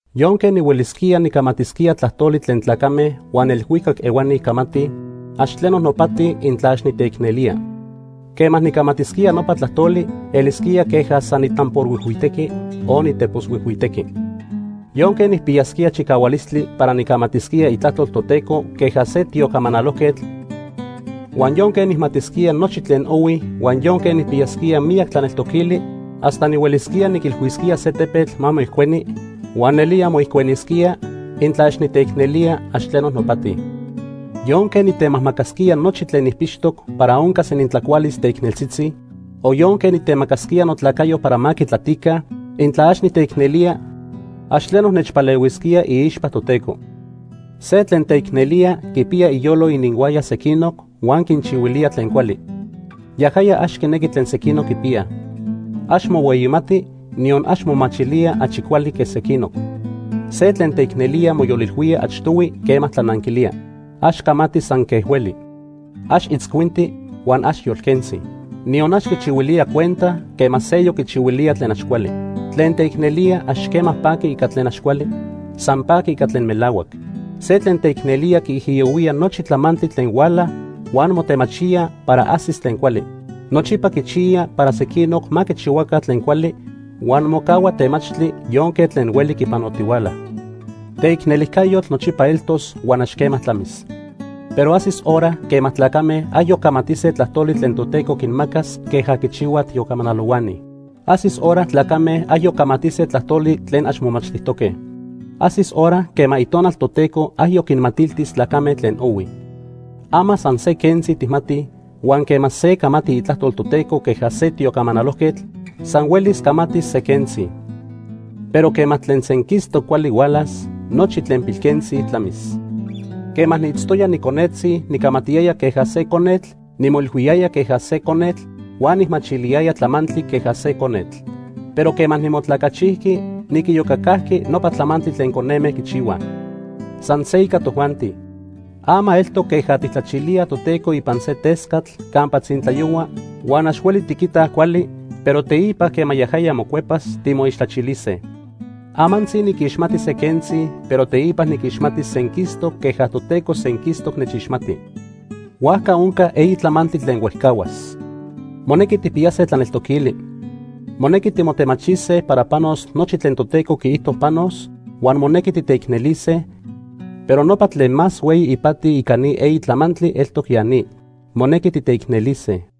Yonque nihuelisquía nicamatisquía tlajtoli tlen tlacame huan elhuicac ehuani camatij, ax tleno nopati intla ax niteicnelía. Quema nicamatisquía nopa tlajtoli elisquía queja san nitamborhuijhuitequi o niteposhuijhuitequi. Yonque nijpiyasquía chicahualistli para nicamatisquía Itlajtol Toteco queja se tiocamanalojquetl, huan yonque nijmatisquía nochi tlen ohui huan yonque nijpiyasquía miyac tlaneltoquili hasta nihuelisquía niquilhuisquía se tepetl ma moijcueni huan nelía moijcuenisquía, intla ax niteicnelía, ax tleno nopati. Yonque nitemajmacasquía nochi tlen nijpixtoc para oncas inintlacualis teicneltzitzi, o yonque nitemacasquía notlacayo para ma quitlatica, intla ax niteicnelía, ax tleno nechpalehuisquía iixpa Toteco. Se tlen teicnelía quipiya iyolo ininhuaya sequinoc huan quinchihuilía tlen cuali. Yajaya ax quinequi tlen sequinoc quipiyaj. Ax mohueyimati, niyon ax momachilía achi cuali que sequinoc. Se tlen teicnelía moyolilhuía achtohui quema tlananquilía. Ax camati san quej hueli. Ax itzcuinti huan ax yolquentzi. Niyon ax quichihuilía cuenta quema seyoc quichihuilía tlen ax cuali. Tlen teicnelía ax quema paqui ica tlen ax cuali, san paqui ica tlen melahuac. Se tlen teicnelía quiijiyohuía nochi tlamantli tlen huala huan motemachía para ajsis tlen cuali. Nochipa quichiya para sequinoc ma quichihuaca tlen cuali huan mocahua temachtli yonque tlen hueli quipanotihuala. Teicnelijcayotl nochipa eltos huan ax quema tlamis. Pero ajsis hora quema tlacame ayoc camatise tlajtoli tlen Toteco quinmacas queja quichihuaj tiocamanalohuani. Ajsis hora tlacame ayoc camatise tlajtoli tlen ax momachtijtoque. Ajsis hora quema Itonal Toteco ayoc quinmatiltis tlacame tlen ohui. Ama san se quentzi tijmatij, huan quema se camati itlajtol Toteco queja se tiocamanalojquetl, san huelis camatis se quentzi. Pero quema tlen senquistoc cuali hualas, nochi tlen pilquentzi tlamis. Quema niitztoya niconetzi nicamatiyaya queja se conetl, nimoilhuiyaya queja se conetl, huan nijmachiliyaya tlamantli queja se conetl. Pero quema nimotlacachijqui, niquiyocacajqui nopa tlamantli tlen coneme quichihuaj. San se ica tojuanti. Ama eltoc queja tijtlachilíaj Toteco ipan se tescatl campa tzintlayohua huan ax hueli tiquitaj cuali, pero teipa quema yajaya mocuepas, timoixtlachilise. Amantzi niquixmati se quentzi, pero teipa niquixmatis senquistoc queja Toteco senquistoc nechixmati. Huajca onca eyi tlamantli tlen huejcahuas. Monequi tijpiyase tlaneltoquili. Monequi timotemachise para panos nochi tlen Toteco quiijto panos, huan monequi titeicnelise, pero nopa tlen más hueyi ipati ica ni eyi tlamantli eltoc ya ni, monequi titeicnelise.